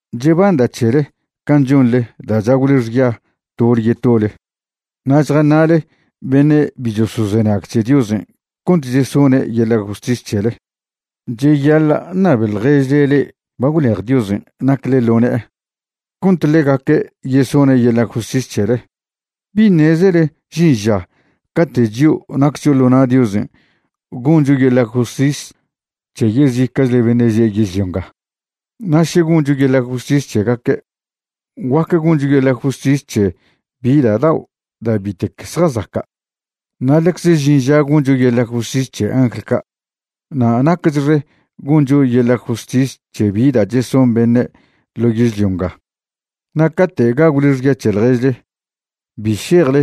Chebanda' c̱hele can' chonḻe da' chagwle xya tole yetole na' chjaṉa'le beṉe' bi chosozenag c̱he Diosen' cont chesone' yeḻa' justis c̱hele. Cheyaḻa' ṉabe ḻježle le'e ba gwlej Diosen' nacle ḻo ne'e cont ḻegaque' yesone' yeḻa' justis c̱hele. ¿Bi ṉezele žin ža cate' chio' naccho ḻo na' Diosen' goncho yeḻa' justis c̱he yezica'chle beṉe' že' yežlio nga? Na' še goncho yeḻa' justis c̱hegaque', guac goncho yeḻa' justis c̱he bi da' dao' da' bitec zjazaca'. Na' ḻecze žin ža goncho yeḻa' justis c̱he angl ca'. Na' naquechxe goncho yeḻa' justis c̱he bi da' cheson beṉe' ḻo yežlio nga. Na' cate' gagwle xya c̱he ḻježle, bi šejle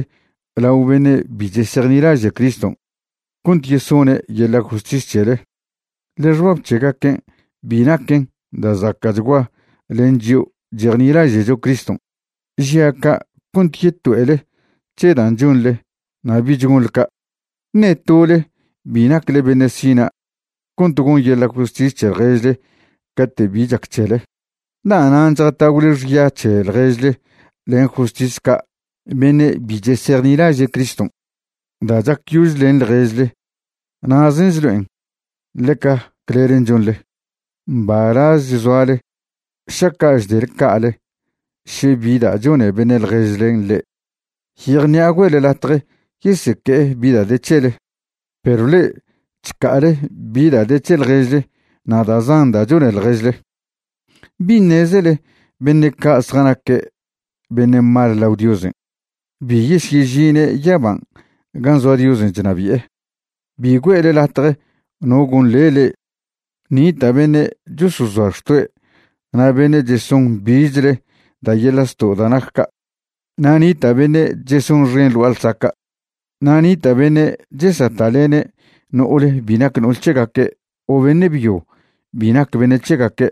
lao beṉe' bi chesejnilaže' Criston' cont yesone' yeḻa' justis c̱hele, ḻe xbab c̱hegaquen' bi naquen da' zaca'chgua len chio' chejnilaže'cho Criston'. Žia' ca' cont yeto'ele c̱he dan' chonḻe na' bich gonḻe ca'. ¿Ṉe tole bi nacle beṉe' sina' cont gon yeḻa' justis c̱he ḻježle cate' bi chac c̱hele? ¿Da'nan' chjatagwle xya c̱he ḻježle len justis ca' beṉe' bi chesejnilaže' Criston'? Da' chacyož len ḻježle na'zen' chlo'en ḻeca clelen' chonḻe. Mbalazech zoale šaca' chdele ca'ale še bi da' chone beṉe' ḻježlen' le'e. Yejṉi'a güe'le latje yeseque'e bi da' de c̱hele. Perw le'e chca'ale bi da' de c̱he ḻježle na' da' zan da' chone ḻježle. ¿Bi ṉezele beṉe' ca' zjanaque' beṉe' mal lao Diosen' bi yesyežine' yaban' gan' zoa Diosen' chnabi'e? Bi güe'le latje no gonḻe le'e. Nita' beṉe' chosozoa xtoe' na' beṉe' cheson bichle da' yeḻa' zto' da' nac ca'. Na' nita' beṉe' chesonxen ḻ gua'a ḻsaca'. Na' nita' beṉe' chesata'lene' no'ole bi nac no'ol c̱hegaque' o beṉe' byo bi nac beṉe' c̱hegaque',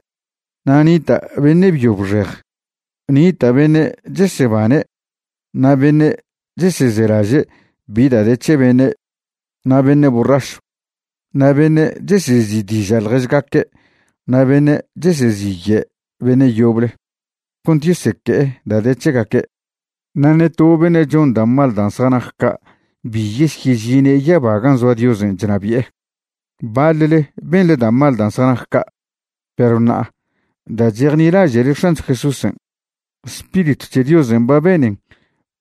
na' nita' beṉe' byo bxej. Nita' beṉe' chesebane' na' beṉe' chesezelaže' bi da' de c̱he beṉe', na' beṉe' borrašw, na' beṉe' chesezi'diža' ḻježgaque' na' beṉe' cheseziye'e beṉe' yoble cont yeseque'e da' de c̱hegaque'. Na' ṉe to beṉe' chon da' mal dan' zjanac ca' bi yesyežine' yaba gan' zoa Diosen' chnabi'e. Baḻle benḻe da' mal dan' zjanac ca', perw ṉa'a da' chejnilaže'le X̱ancho Jesúsen', Spiritw c̱he Diosen' ba benen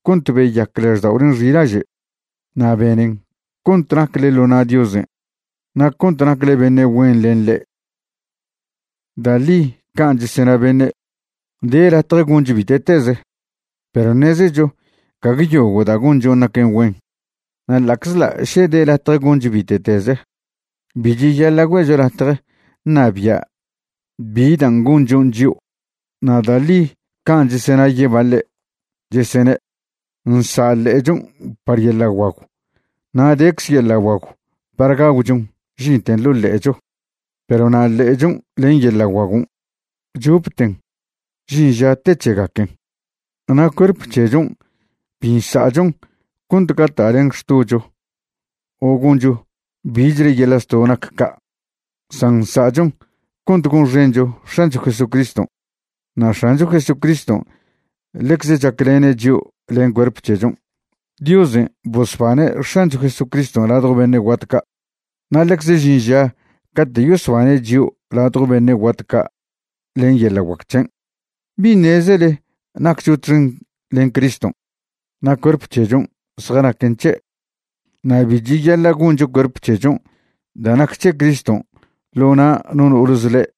cont beyac lažda'olen' xilaže', na' benen cont nacle ḻo na' Diosen' na' cont nacle beṉe' güen len ḻe'. Da' ḻi can' chesena beṉe', de latje goncho bite'teze, perw ṉezecho gague yogo' da' gonchon' naquen güen. Na' ḻa'czḻa' še de latje goncho bite'teze, bi cheyaḻa' güe'cho latje ṉabia' bi dan' gonchon' chio'. Na' da' ḻi can' chesena yebaḻe', chesene': “Nsa' ḻe'echon' par yeḻa' guagw na' decze yeḻa' guagw par gagwchon žinten ḻo' ḻe'echo.” Perw na' ḻe'echon' len yeḻa' guagon', chopten žin ža te c̱hegaquen. Na' cuerp c̱hechon' bi nsa'chon cont gata'len xtocho o goncho bichle yeḻa' zto' nac ca'. San nsa'chon cont gonxencho X̱ancho Jesucriston'. Na' X̱ancho Jesucriston' ḻecze chaclene' chio' len cuerp c̱hechon'. Diosen' bosbane' X̱ancho Jesucriston' ladjo beṉe' guat ca', na' ḻecze žin ža cate' yosbane' chio' ladjo beṉe' guat ca' len yeḻa' guac c̱hen'. ¿Bi ṉezele naccho txen len Criston' na' cuerp c̱hechon' zjanaquen c̱he'? Na' bi cheyaḻa' goncho cuerp c̱hechon' da' nac c̱he Criston' ḻo na' no no'ole zḻe'.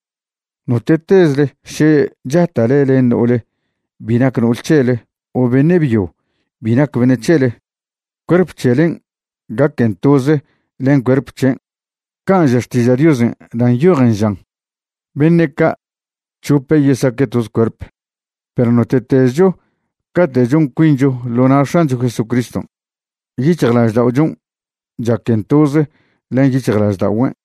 Note'tezle še chata'le len no'ole bi nac no'ol c̱hele o beṉe' byo bi nac beṉe' c̱hele, cuerp c̱helen' gaquen toze len cuerp c̱hen', can' ža Xtiža' Diosen' da' nyojen žan: “Beṉe' ca' c̱hope yesaque' toze cuerp.” Perw note'tezcho cate' chon cuincho ḻo na' X̱ancho Jesucriston', yic̱hjlažda'ochon' chaquen toze len yic̱hjlažda'ogüen'.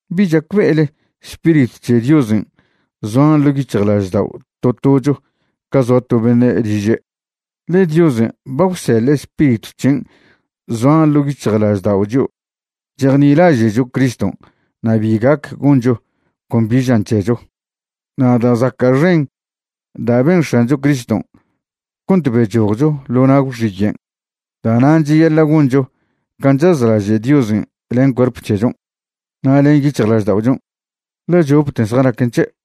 ¿Bi chacbe'ele Spiritw c̱he Diosen' zoan ḻo' yic̱hjlaždao' to tocho ca zoa to beṉe' liže'? ḻe Diosen' ba gwseḻe' Spiritw c̱hen' zoan ḻo' yic̱hjlaždao' chio' chejnilaže'cho Criston', na' bi gac goncho con bi žan c̱hecho. Na' da' zaca' xen da' ben X̱ancho Criston' cont bechojcho ḻo na' gwxiyen'. Da'nan' cheyaḻa' goncho can' chazlaže' Diosen' len cuerp c̱hechon' na' len yic̱hjlažda'ochon', ḻe chopten zjanaquen c̱he'.